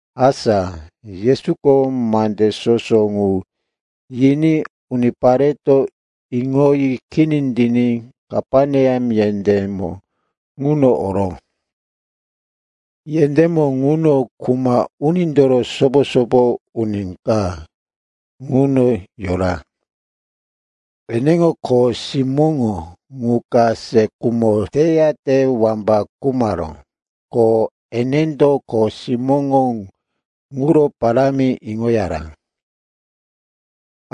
Asa Yesuko mande soso ŋu yiní unipareto iŋoyi kini tiní Kaperneam yendémo ŋuno oró. Yendémo ŋuno kuma unindoro sopo-sopo uni ka ŋuno yora, eneŋo kho simóŋo qu ka se khumo teyate wamba khumaró. Ko enendo kho simóŋo ŋuro parámi iŋoyara.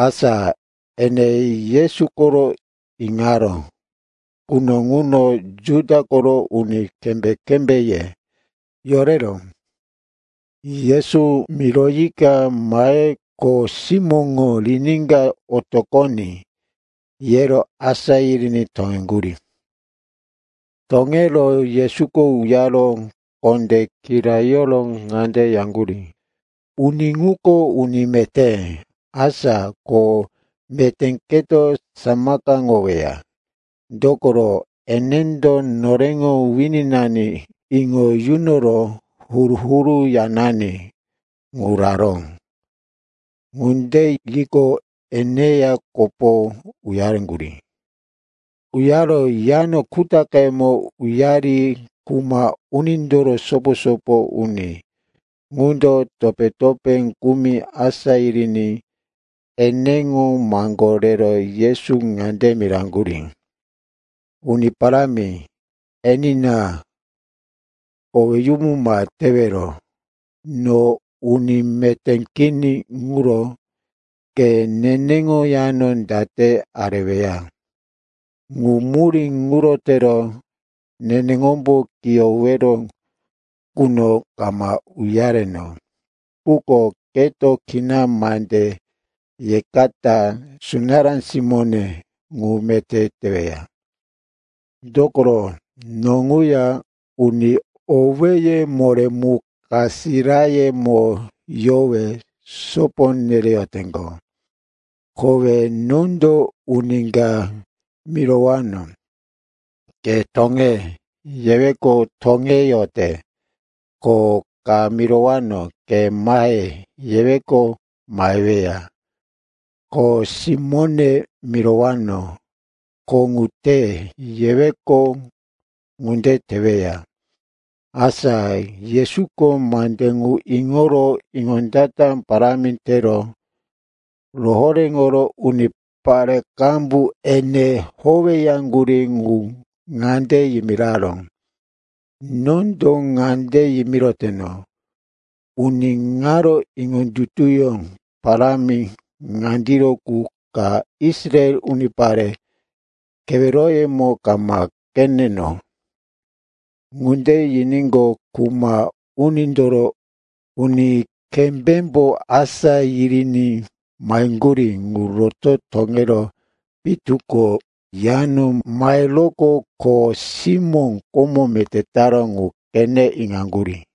Asa ene Yesu koro iŋaró quno ŋuno Juda koro uni kembé-kembéye yorero, Yesu miroyika mahe kho simóne riníka otoqoní, yero asá yiriní toŋeŋgurí. Toŋero Yesuko uyaro kondé kirayoro ŋande yaŋgurí, “Uni ŋuko uni meté, asa ko meté keto samakaŋoweya. Dokoro enendo noreŋo wininani iŋo yunoro huru-huru yanani ŋu raró.” Ŋunde yiqo, eneya kopo uyareŋgurí. Uyaro yano kutaqemo uyari kuma unindoro sopo-sopo uni ŋundo topé-topé kumi asá yiriní eneŋo maŋgó rero Yesu ŋande miraŋgurí, “Uni parámi, enina, koweyumu ma tewero. No uni meté kini ŋuro ke neneŋo yano date areweya. Ŋu murí ŋuro tero neneŋombo kiyowero ŋuno kama uyareno. Quko keto kina mande yekata sunará simóne ŋu meté teweya. Dokoro no ŋuya uni owéye moré mu kasirayemo yowe sopo nereyoteŋgo. Kowe nondo uni ka mirowano, ‘Ke toŋe,’ yeweqo, toŋeyote. Ko ka mirowano, ‘Ke mahe,’ yeweqo, maheweya. Kho simóne mirowano, ‘Kho ŋu te,’ yeweqo, ŋunde teweya.” Asa Yesuko mande ŋu iŋoro iŋondata parámi tero rohoréŋoro unipare qambu ene howeyaŋgurí ŋu ŋande yimiraró, “Nondo ŋande yimiroteno, uni ŋaro iŋondutuyó parámi ŋandiro qu ka Israel unipare keweroyemo kama qeneno.” Ŋunde yiníqo, kuma unindoro uni kembémbo asá yiriní maheŋgurí ŋu roto toŋero pitu ko yano maheroqo kho simó komo meté taró ŋu qene iŋaŋgurí.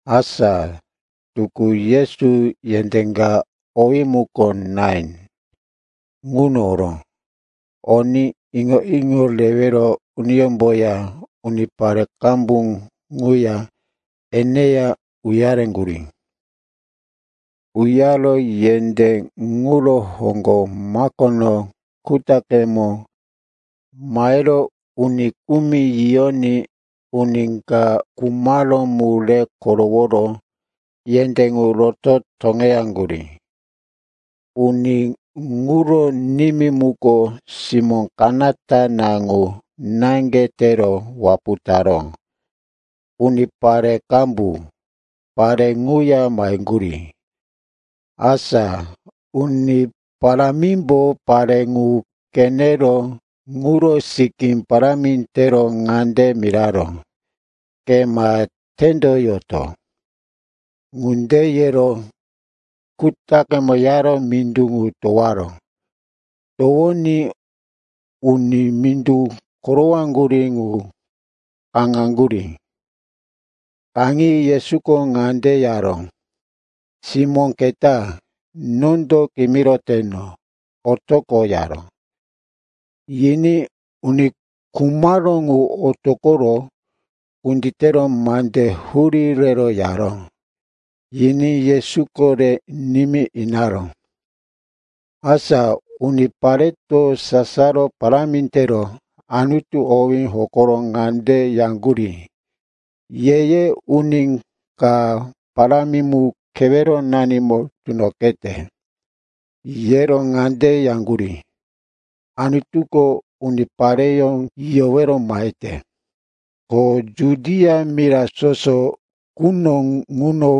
Asa tukú Yesu yendé ka, owí muko Nain, ŋuno oró. Oní iŋo-iŋo rewero uniyómboya unipare qambu ŋuya eneya uyareŋgurí. Uyaro yendé ŋuro hoŋgo makono kutaqemo mahero uni kumi yiyoní uni ka khumaró mu re koroworo yendé ŋu roto toŋeyaŋgurí. Uni ŋuro nimí muko, simó kanata na ŋu naŋge tero wapu taró. Unipare qambu pare ŋuya maheŋgurí. Asa Uni Parámimbo pare ŋu qenero ŋuro sikí parámi tero ŋande miraró, “Ke ma tendoyoto.” Ŋunde yero kutaqemo uyaro mindu ŋu towaró. Towoní uni mindu korowaŋgurí ŋu kaŋaŋgurí. Kaŋi Yesuko ŋande yaró, “Simó keta, nondo kimiroteno, otoqo,” yaró. Yiní uni khumaró ŋu otoqoro kunditero mande hurí rero yaró. Yiní Yesuko re nimí inaró. Asa unipareto sasaro parámi tero Anutu owí hokoro ŋande yaŋgurí, “Ye-ye uni ka parámi mu keweronanimo tunoqete.” Yero ŋande yaŋgurí, “Anutuko unipareyó yiyowero mahete.” Ko Judia mira soso quno ŋuno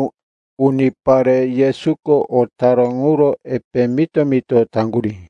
unipare Yesuko o taró ŋuro epe mito-mito taŋgurí.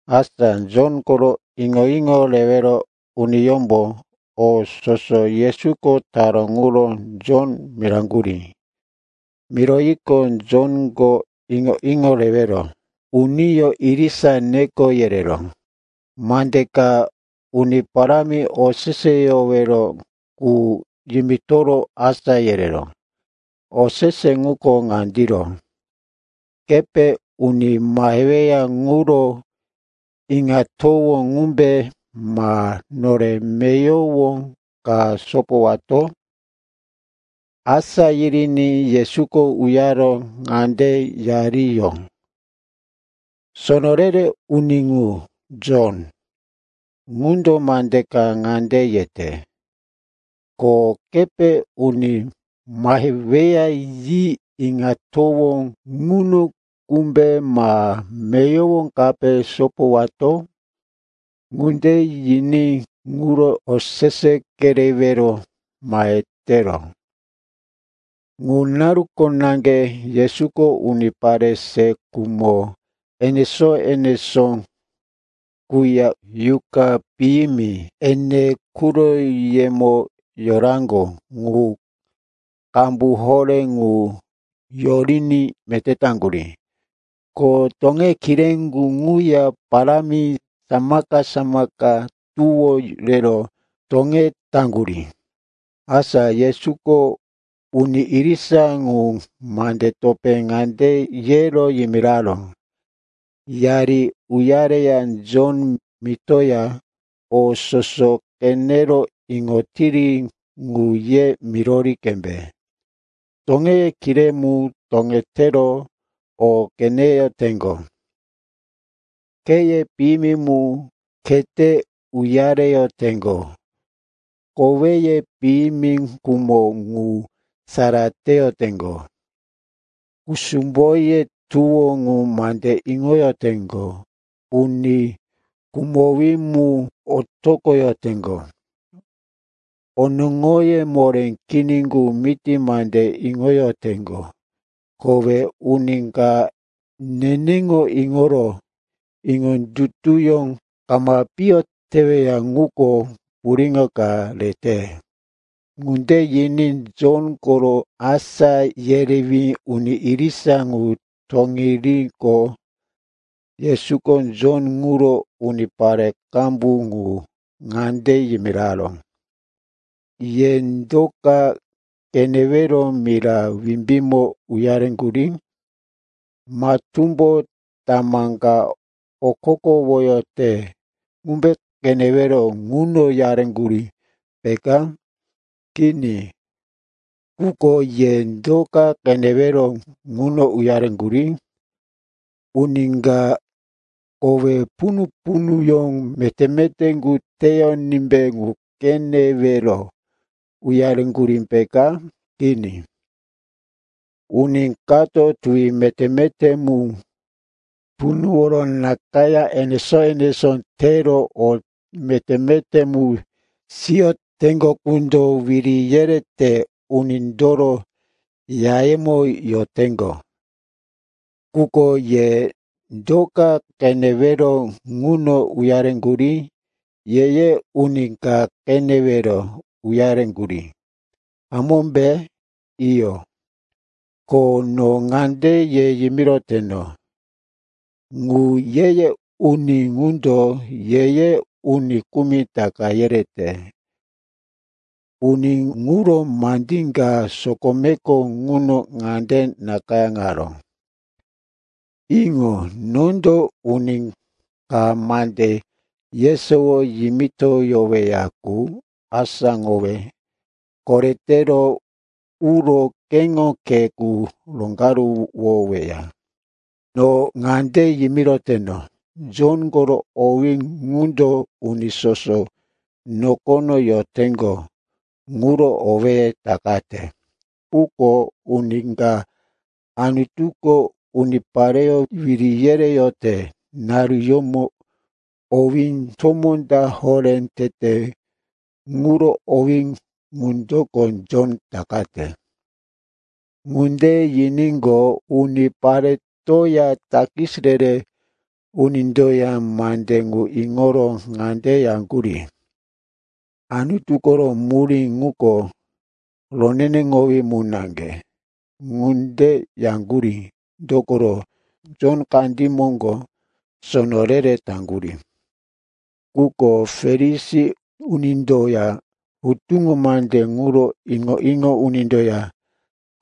Asa Jon koro iŋo-iŋo rewero uniyómbo o soso Yesuko taró ŋuro Jon miraŋgurí. Miroyiqo, Jonko iŋo-iŋo rewero uniyó irisa neko yerero mande ka Uni Parámi oseseyowero qu yimitoro asá yereró. Osese ŋuko ŋandiro, “Kepe uni maheweya ŋuro iŋatowó ŋumbe, ma nore meyowo ka sopowato?” Asá yiriní Yesuko uyaro ŋande yariyó, “Sono re-re uni ŋu, Jon, ŋundo mande ka ŋande yete, ‘Ko kepe uni maheweya yi iŋatowó ŋuno qumbe, ma meyowo kape sopowato?’ Ŋunde yiní ŋuro osese kerewero mahetero.” Ŋu naruko naŋge Yesuko unipare se khumo enesó-enesó quya yuqa piyimi ene quroyemo yoraŋgo qu qambu horé ŋu yoriní meté taŋgurí. Ko toŋeye kiré qu ŋuya parámi samaka-samaka tuwó rero toŋetaŋgurí. Asa Yesuko uni irisa ŋu mande topé ŋande yero yimiraró, “Yari uyareya Jon mitoya o soso qenero iŋotiri ŋu ye mirori qembe. Toŋeye kiré mu toŋetero o qeneyoteŋgo, kheye piyimi mu khete uyareyoteŋgo, koweye piyimi khumo qu sara teyoteŋgo, kusumboye tuwo qu mande iŋoyoteŋgo, uni khumowí mu otoqoyoteŋgo, onoŋoye moré kini qu miti mande iŋoyoteŋgo. Kowe uni ka neneŋo iŋoro iŋondutuyó kama piyo teweya ŋuko puriŋo ka rete.” Ŋunde yiní Jon koro asá yerewí uni irisa ŋu toŋiriqo, Yesuko Jon ŋuro unipare qambu ŋu ŋande yimiraró, “Ye do ka qenewero mira wimbímo uyareŋgurí? Matúmbo tamá ka okokowoyote ŋumbe qenewero ŋuno uyareŋgurí, peka? Kini. Quko ye do ka qenewero ŋuno uyareŋgurí? Uni ka kowe punu-punuyó meté-meté mu teyonímbe ŋu qenewero uyareŋgurí, peka? Kini, uni kato tuwi meté-meté mu punuworo nakayá enesó-enesó tero o meté-meté mu siyoteŋgo qundo wiri yerete unindoro yayemo yoteŋgo. Quko ye do ka qenewero ŋuno uyareŋgurí? Ye-ye uni ka qenewero uyareŋgurí, hamómbe? Iyo, ko no ŋande ye yimiroteno, ŋu ye-ye uni ŋundo ye-ye uni kumi taka yerete. Uni ŋuro mande ka sokomeko ŋuno ŋande nakayáŋaró, “‘Iŋo, nondo uni ka mande yesowo yimitoyoweya qu asáŋowe koretero uro keŋo khe qu roŋgaruwoweya.’ “No ŋande yimiroteno, Jon koro owí ŋundo uni soso nokono yoteŋgo ŋuro owéye takate. Quko uni ka Anutuko unipareyó wiri yereyote naruyómo owí tomó ta horé tete ŋuro owí ŋundoko Jon takate.” Ŋunde yiníqo, uniparetoya takis re-re unindoya mande ŋu iŋoro ŋande yaŋgurí, “Anutu koro murí ŋuko roneneŋowí mu naŋge.” Ŋunde yaŋgurí dokoro Jon kandí moŋgo sono re-re taŋgurí. Quko Farisi unindoya hutuŋo mande ŋuro iŋo-iŋo unindoya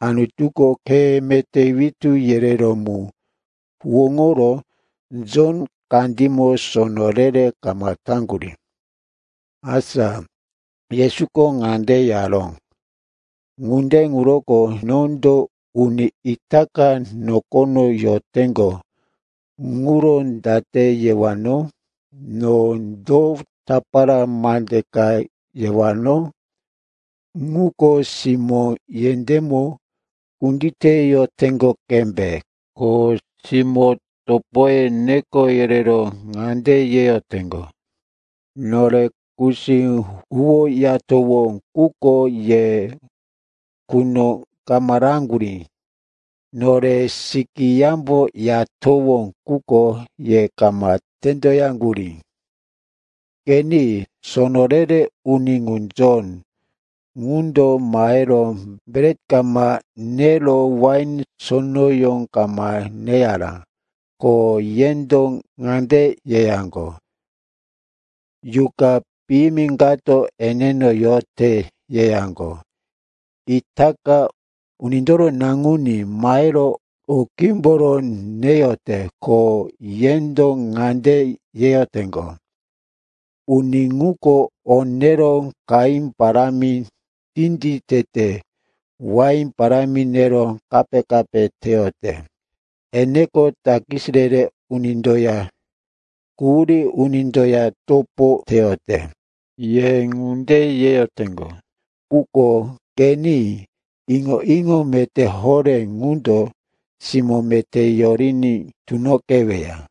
Anutuko khe meté witú yereró mu huwóŋoro Jon kandímo sono re-re kama taŋgurí. Asa Yesuko ŋande yaró, “Ŋunde ŋuroko nondo uni itaka nokono yoteŋgo ŋuro date yewano? No do tapara mande ka yewano? Ŋuko simó yendémo kunditeyoteŋgo qembe, ko simó topoye neko yerero ŋande yeyoteŋgo, “‘Nore kusí huwoyatowó, quko ye quno kama raŋgurí. Nore sikí yambo yatowó, quko ye kama tendoyaŋgurí.’ “Qeni, sono re-re uni ŋu, Jon, ŋundo mahero bret kama nero wain sonoyó kama neyara. Ko yendo ŋande yeyaŋgo, ‘Yuqa piyimi kato eneno yote,’ yeyaŋgo. Itaka Unindoro Naŋuní mahero o qímboro neyote. Ko yendo ŋande yeyoteŋgo, ‘Uni ŋuko o nero qahí parámi tinditete, wain parámi nero kape-kape teyote. Eneko takis re-re unindoya quhurí unindoya topo teyote.’ Ye ŋunde yeyoteŋgo, quko qeni, iŋo-iŋo meté horé ŋundo simó meté yoriní tunoqeweya.”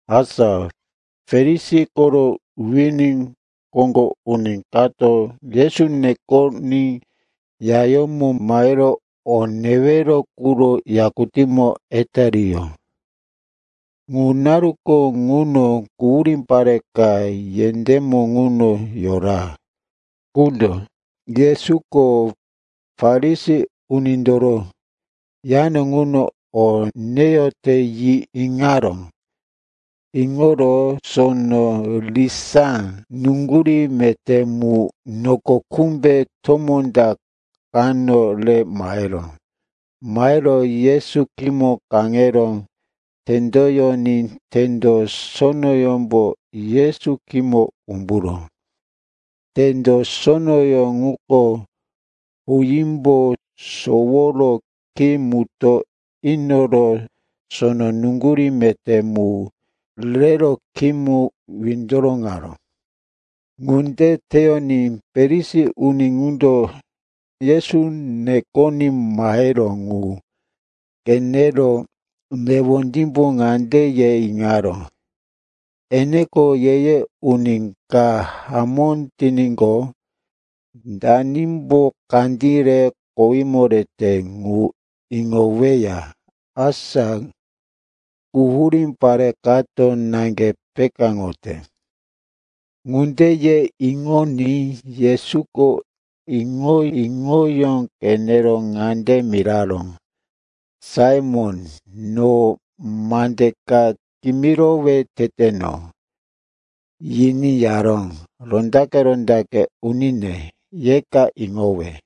Asa Farisi koro wini koŋgo uni kato Yesu nekoní yayómo mahero o newero quro yakutímo etariyó. Ŋu naruko ŋuno quhurí pare ka yendémo ŋuno yora qundo, Yesuko Farisi unindoro yano ŋuno o neyote, yi iŋaró. Iŋoro sono risá nuŋgurí meté mu noko kumbe tomó ta kano re maheró. Mahero Yesu khímo kaŋero tendoyoní tendo sonoyómbo Yesu khímo umburó. Tendo sonoyó ŋuko huímbo soworo khí mutó inoro sono nuŋgurí meté mu rero khímo windoroŋaró. Ŋunde teyoní Farisi uni ŋundo Yesu nekoní maheró ŋu qenero newondímbo ŋande ye iŋaró, “Eneko ye-ye uni ka hamó tiníqo, danimbo kandí re kowímo rete ŋu iŋoweya, asa quhurí pare kato naŋge pekáŋote.” Ŋunde ye iŋoní Yesuko iŋo-iŋoyó qenero ŋande miraró, “Saimon, no mande ka kimirowe teteno.” Yiní yaró, “Rondaqe-rondaqe unine, yeka iŋowe.”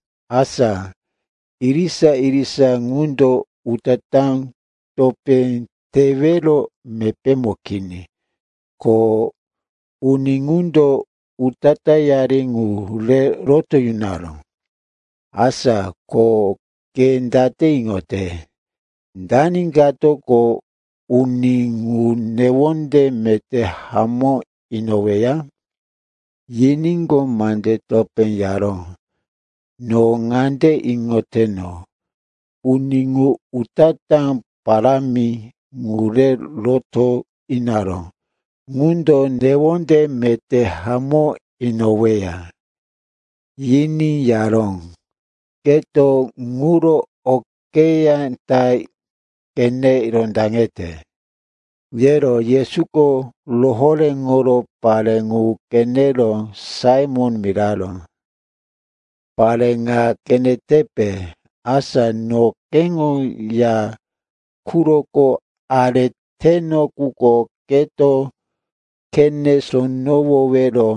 Asa irisa-irisa ŋundo utatá topé tewero mepémo kini, ko uni ŋundo utatáyari ŋu re roto yunaró. Asa ko ke date iŋote, dani katoko uni ŋu newonde meté hamó inoweya?” Yiníqo, mande topé yaró, “No ŋande iŋoteno, uni ŋu utatá parámi ŋu re roto inaró ŋundo newonde meté hamó inoweya.” Yiní yaró, “Keto ŋuro okeyá ta qene rondaŋete.” Yero Yesuko rohoréŋoro pare ŋu qenero Saimon miraró, “Pare ŋa qenetepe? Asa no keŋo ya quroko areteno quno keto khene sonowowero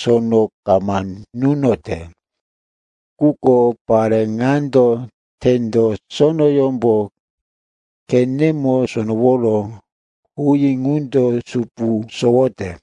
sono kama nunote. Quko pare ŋando tendo sonoyómbo khene sonoworo huí ŋundo supu sowote.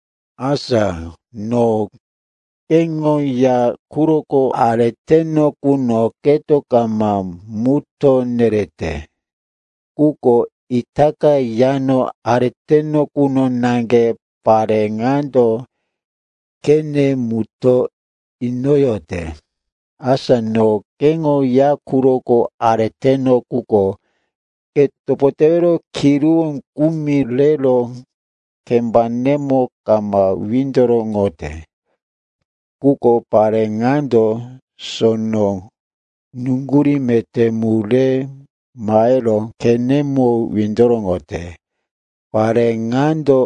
Asa no keŋo ya quroko areteno quno keto kama mutó nerete. Quko itaka yano areteno quno naŋge pare ŋando khene mutó inoyote. Asa no keŋo ya quroko areteno quno ke topo tewero kiruwó kumi rero kembanemo kama windoroŋote. Quko pare ŋando sono nuŋgurí meté mu re mahero khenemo windoroŋote. Pare ŋando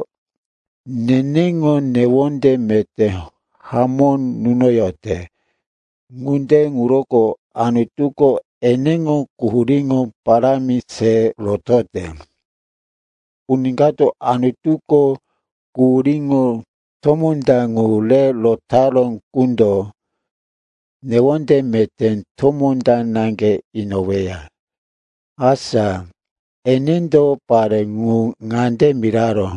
neneŋo newonde meté hamó nunoyote. Ŋunde ŋuroko Anutuko eneŋo quhuríŋo parámi se rotote. Uni kato Anutuko quhuríŋo tomó ta ŋu re rotaró qundo newonde meté tomó ta naŋge inoweya.” Asa enendo pare ŋu ŋande miraró,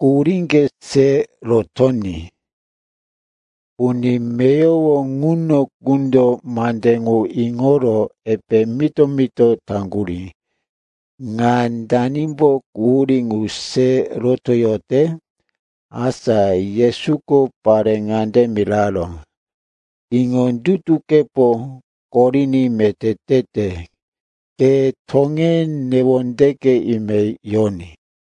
“Quhuríŋge se rotoní.” Uni meyowo ŋuno qundo mande ŋu iŋoro epe mito-mito taŋgurí, “Ŋa danimbo quhurí ŋu se rotoyote?” Asa Yesuko pare ŋande miraró, “Iŋondutukepo koriní meté tete. Ke toŋe, newondeke ime yoní.”